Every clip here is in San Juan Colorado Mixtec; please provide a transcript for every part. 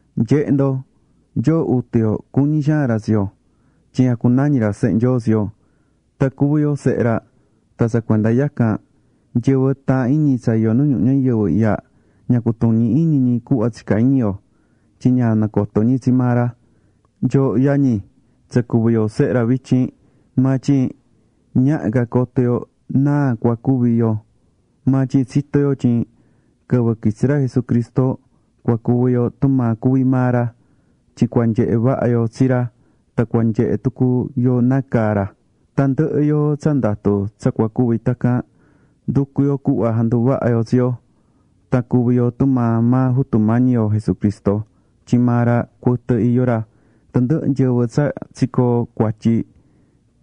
Nye̱he ndo, Nyoo Jutu yo cuñí xaan ra tsi yo, tyin jacunañí ra sehe Nyoo tsi yo. Tan cuví yo sehe ra. Tan tsa cuenda yacan, nyɨvɨ taahán iñi tsa iyó nu ñuhu ñayɨvɨ ihya ña cutuñi iñi ñi cuhva tsicá iñi yo tyin ña nacoto ñi tsi maa ra. Nyooho yañi, tsa cuví yo sehe ra vityin, maa tyin ñaha ca coto yo náa cua cuvi yo. Maa tyin tsitó yo tyin quɨvɨ quitsi ra Jesucristo, cua cuvi yo tumaa cuví maa ra, tyin cua nyehe vaha yo tsi ra tan cua nyehe tucu yo nácaa caá ra. Tandɨhɨ yoo tsa ndatú tsa cua cuvi tacan, nducú yo cuhva janduvaha yo tsi yo, tan cuvi yo tumaa maa Jutu Mañi yo Jesucristo, tyin maa ra cuɨtɨ iyó ra. Tandɨhɨ nyɨvɨ tsa tsicoó cuatyi,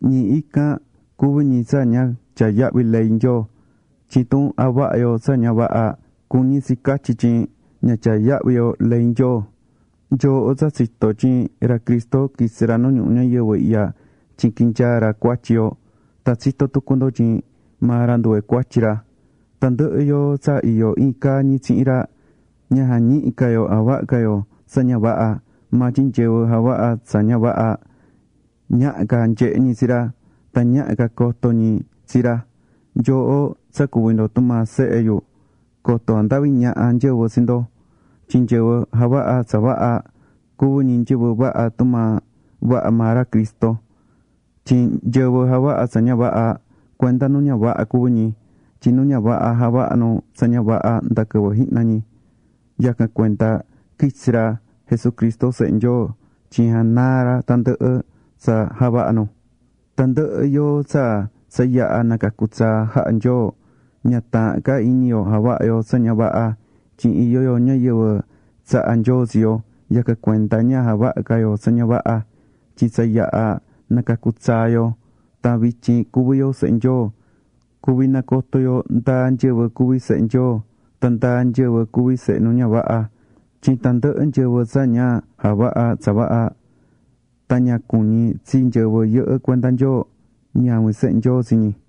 ñi ican cuví ñi tsa ña tyaá yahvi ley Nyoo. Tyin tun javahá yo tsa ña vaha, cuñí tsi catyi tyin ña tyaá yahvi yo ley Nyoo. Nyooho tsa tsitó tyin ra Cristo quitsi̱ ra nu ñuhu ñayɨvɨ ihya tyin quinyaa̱ ra cuatyi yo, tan tsitó tucu ndo tyin maa ra nduve cuatyi ra. Tandɨhɨ yoo tsa iyó iin caa ñi tsihin ra, ña jañihí ca yo javahá ca yo tsa ña vaha. Maa tyin nyɨvɨ javahá tsa ña vaha, ñaha ca nyehe ñi tsi ra, tan ñaha ca coto ñi tsi ra. Nyooho, tsa cuví tumaa sehe yu, coto jandavi ñaha nyɨvɨ tsi ndo. Tyin nyɨvɨ javahá tsa vaha, cuví ñi nyɨvɨ vaha, tumaa vaha maa ra Cristo. Tyin nyɨvɨ javahá tsa ña vaha, cuenda nu ña vaha cuví ñi. Tyin nu ña vaha javahá nu tsa ña vaha nda quɨvɨ jihna ñi. Yacan cuenda quitsi̱ ra Jesucristo, Sehe Nyoo, tyin janaa ra tandɨhɨ tsa javahá nu. Tandɨhɨ yoo tsa tsa yaha̱ nacacu̱ tsaa jaha̱ Nyoo, ña taahán ca iñi yo javahá yo tsa ña vaha, tyin iyó yo ñayɨvɨ tsaha̱ Nyoo tsi yo. Yacan cuenda ña javahá ca yo tsa ña vaha, tyin tsa yaha̱ nacacu̱ tsaa yo tan vityin cuví yo sehe Nyoo. Cuví nacotó yo ndáa nyɨvɨ cuví sehe Nyoo, tan ndáa nyɨvɨ cuví sehe nu ña vaha, tyin tandɨhɨ nyɨvɨ tsa ña javahá tsa vaha tan ña cuñí tsi nyɨvɨ yɨhɨ́ cuenda Nyoo, ñavin sehe Nyoo tsi ñi.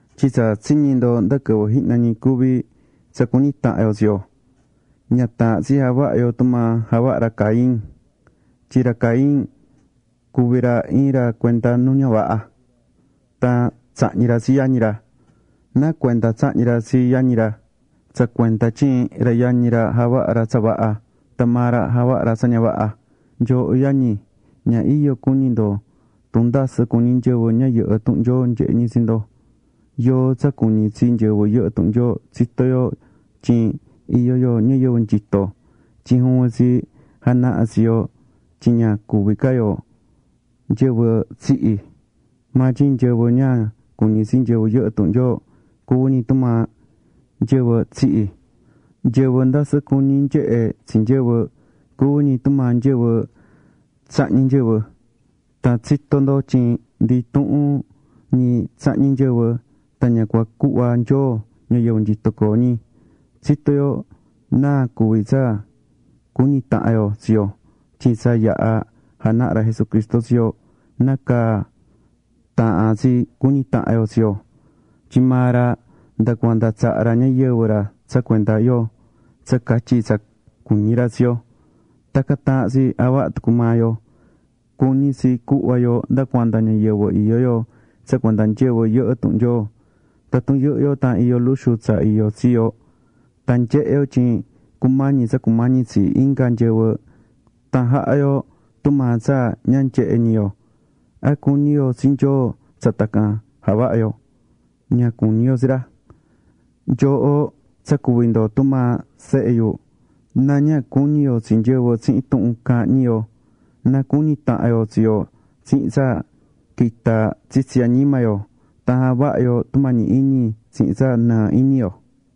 Tyin tsa tsiñi̱ ndo nda quɨvɨ jihna ñi cuví: Tsa cu̱ñi tahan yo tsi yo. Ña taahán tsi javaha yo tumaa javaha̱ ra Caín, tyin ra Caín cuvi̱ ra iin ra cuenda nu ña vaha. Tan tsahñi̱ ra tsi yañi ra. ¿Náa cuenda tsahñi̱ ra tsi yañi ra? Tsa cuenda tyin ra yañi ra javaha̱ ra tsa vaha, tan maa ra javaha̱ ra tsa ña vaha. Nyooho yañi, ña iyo cuñi ndo tun ndasɨ cuñí nyɨvɨ ña yɨhɨ́ tuhun Nyoo nyehé ñi tsi ndo. Yoo tsa cuñí tsi nyɨvɨ yɨhɨ́ tuhun Nyoo tsitó yo tyin iyó yo ñayɨvɨ nyito, tyin juvin tsi janahá tsi yo tyin ña cuví ca yo nyɨvɨ tsihi̱. Maa tyin nyɨvɨ ña cuñí tsi nyɨvɨ yɨhɨ́ tuhun Nyoo, cuví ñi tumaa nyɨvɨ tsihi̱. Nyɨvɨ ndasɨ cuñí nyehé tsi nyɨvɨ, cuví ñi tumaa nyɨvɨ tsahñí nyɨvɨ. Tan tsitó ndo tyin ndi intuhun ñi tsahñí nyɨvɨ, tan ña cua cuhva Nyoo ñayɨvɨ nyito coo ñi. Tsitó yo náa cuví tsa cuñí tahan yo tsi yo tyin tsa yaha̱ janaha̱ ra Jesucristo tsi yo nácaa taahán tsi cuñi tahan yo tsi yo. Tyin maa ra nda cuanda tsaha̱ ra ñayɨvɨ ra tsa cuenda yo tsa catyi tsa cuñí ra tsi yo. Tacan taahán tsi javaha tucu maa yo. Cuñí tsi cuhva yo nda cuanda ñayɨvɨ iyó yo tsa cuenda nyɨvɨ yɨhɨ́ tuhun Nyoo. Tatun yɨhɨ́ yo tan iyó luxu tsa iyó tsi yo, tan nyehé yo tyin cumañí tsa cumañí tsi inga nyɨvɨ, tan jahá yo tumaa tsa ña nyehé ñi yo, ¿a cuñí yo tsi Nyoo tsa tacan javahá yo? Ña cuñí yo tsi ra. Nyooho tsa cuví ndo tumaa sehe yu, na ña cuñi yo tsi nyɨvɨ tsihin tuhun caahán ñi yo, na cuñi tahan yo tsi yo tsihin tsa quitá tsitsi añima yo tan javahá yo tumañi iñi tsihin tsa nɨɨ iñi yo.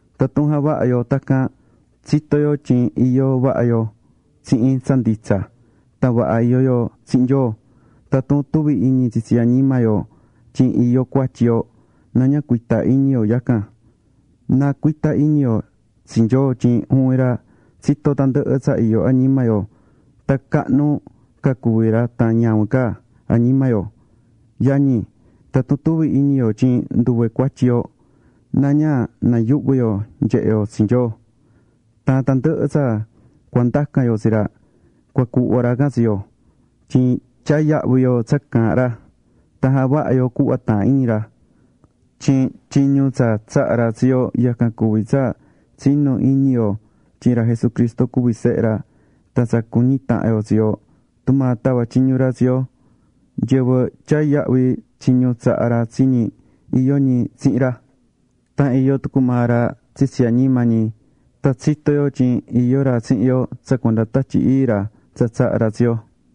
Tatun javahá yo tacan, tsitó yo tyin iyó vaha yo tsihin tsa nditsa. Tan vaha iyó yo tsihin Nyoo. Tatun tuví iñi tsitsi añima yo tyin iyó cuatyi yo, na ña cuita iñi yo yacan. Na cuita iñi yo tsi Nyoo tyin juvin ra tsitó tandɨhɨ tsa iyó añima yo tan cahnu ca cuví ra tan ñavin ca añima yo. Yañi, tatun tuví iñi yo tyin nduve cuatyi yo, na ña nayuhvi yo nyehe yo tsi Nyoo. Tan tandɨhɨ tsa cua ndacan yo tsi ra, cua cuhva ra can tsi yo, tyin tyaá yahvi yo tsa caahán ra, tan javahá yo cuhva taahán iñi ra. Tyin tyiñu tsa tsaha̱ ra tsi yo yacan cuví tsa tsi̱nu iñi yo tyin ra Jesucristo cuví Sehe ra, tan tsa cu̱ñi tahan yo tsi yo, tumaa tava̱ tyiñu ra tsi yo. Nyɨvɨ tyaá yahvi tyiñu tsaha̱ ra tsi ñi, iyó ñi tsihin ra, tan iyó tucu maa ra tsitsi añima ñi. Tan tsitó yo tyin iyó ra tsihin yo tsa cuenda Tatyi Ii ra tsa tsaha̱ ra tsi yo.